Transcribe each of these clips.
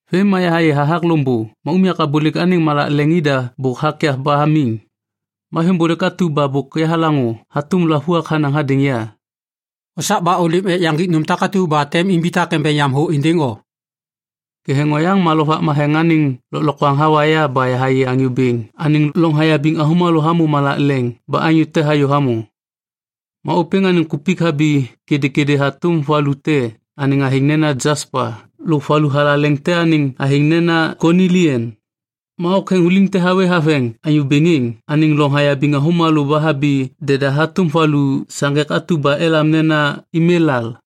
Vêm ma yahayê hathak loŋbô ma unyak abôlêk anêŋ malak leŋ ida bôk hakyav ba hamiŋ. Ma veŋbôlêk atu ba bôk yahalaŋô hatôm lavuak hanaŋ hadêŋ ya, “Osak ba ôlêm ek yaŋgik nôm takatu ba tem imbitak embeŋ yam thô êndêŋ o.” Ketheŋ oyaŋ ma Lovak Matheŋ anêŋ lôklokwaŋ hawa ya ba yahayê Anyô Bêŋ anêŋ loŋ hayabiŋ avômalô hamô malak leŋ ba anyô te hayô hamô. Ma ôpêŋ anêŋ kupik habi kêdêkêdê hatôm valu te anêŋ athêŋ nena jaspa lôk valu thalaleŋ te anêŋ athêŋ nena konilian. Ma oktheŋuliŋ te hawê haveŋ Anyô Bêŋ êŋ anêŋ loŋ hayabiŋ avômalô ba habi deda hatôm valu saŋgek atu ba elam nena emelal.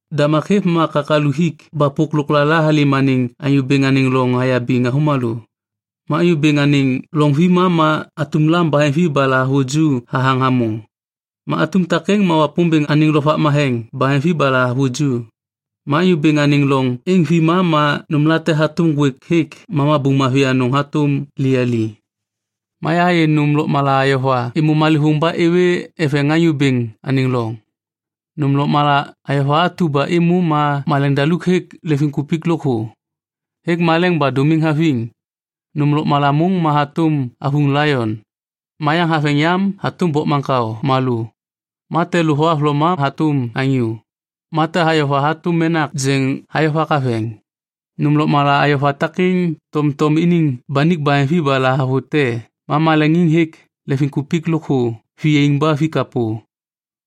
Damak hêv ma kakalu hik ba pôk lôklala halêm anêŋ Anyô Bêŋ anêŋ loŋ hayabiŋ avômalô. Ma Anyô Bêŋ anêŋ loŋ vima ma atum lam baheŋvi ba lahavuju hathaŋ hamô. Ma atum takêŋ ma Wapômbêŋ anêŋ lovak matheŋ baheŋvi ba lahavuju. Ma Anyô Bêŋ anêŋ loŋ êŋ vima ma nômlate hatôm ŋgwêk hêk ma mabuŋ mavi anôŋ hatôm liyali. Ma yahayê nôm lôkmala ayova êmô malêvôŋ ba êwê eveŋ Anyô Bêŋ anêŋ loŋ. Nôm lôkmala ayova atu ba êmô ma maleŋdaluk hêk leŋviŋkupik lôkthô, hêk maleŋ ba dômiŋ haviŋ. Nôm lôkmala môŋ ma hatôm avuŋ laion, ma yaŋ haveŋ yam hatôm bokmaŋkao malô. Ma te lu thohavloma hatôm anyô. Ma te ayova hatôm menak jeŋ hayovak haveŋ. Nôm lôkmala ayova takêŋ tomtom iniŋ banik baheŋvi ba lahavute ma maleŋiŋ hêk leŋviŋkupik lôkthô viyaiŋ ba vikapô.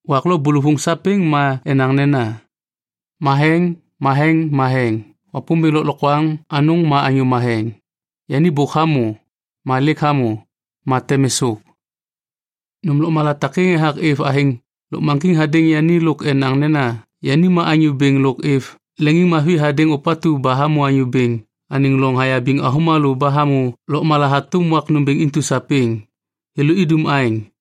Wak lo bôlôvôŋ sapêŋ ma enaŋ nena, “Matheŋ, matheŋ, matheŋ. Wapômbêŋ Lôklokwaŋ Anôŋ ma anyô matheŋ. Yani bôk hamô, ma lêk hamô, ma tem êsôk.” Nôm lôkmala takêŋ ethak êv athêŋ lôkmaŋgiŋ hadêŋ yani lôk enaŋ nena yani ma Anyô Bêŋ lôk êv leŋiŋmavi hadêŋ ôpatu ba hamô Anyô Bêŋ anêŋ loŋ hayabiŋ avômalô ba hamô lôkmala hatôm wak nômbêŋ intu sapêŋ. Thêlô idum aêŋ,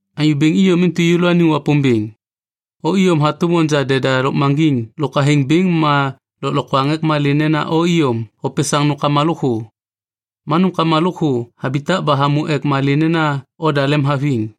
“Anyô Bêŋ iyom intu yêlôaniŋ Wapômbêŋ. O iyom hatôm onja deda lôkmaŋgiŋ lôk athêŋ bêŋ ma lôklokwaŋ ek malê nena o iyom hopesaŋ nômkama lôkthô. Ma nômkama lôkthô habitak ba hamô ek malê nena oda lemhaviŋ.”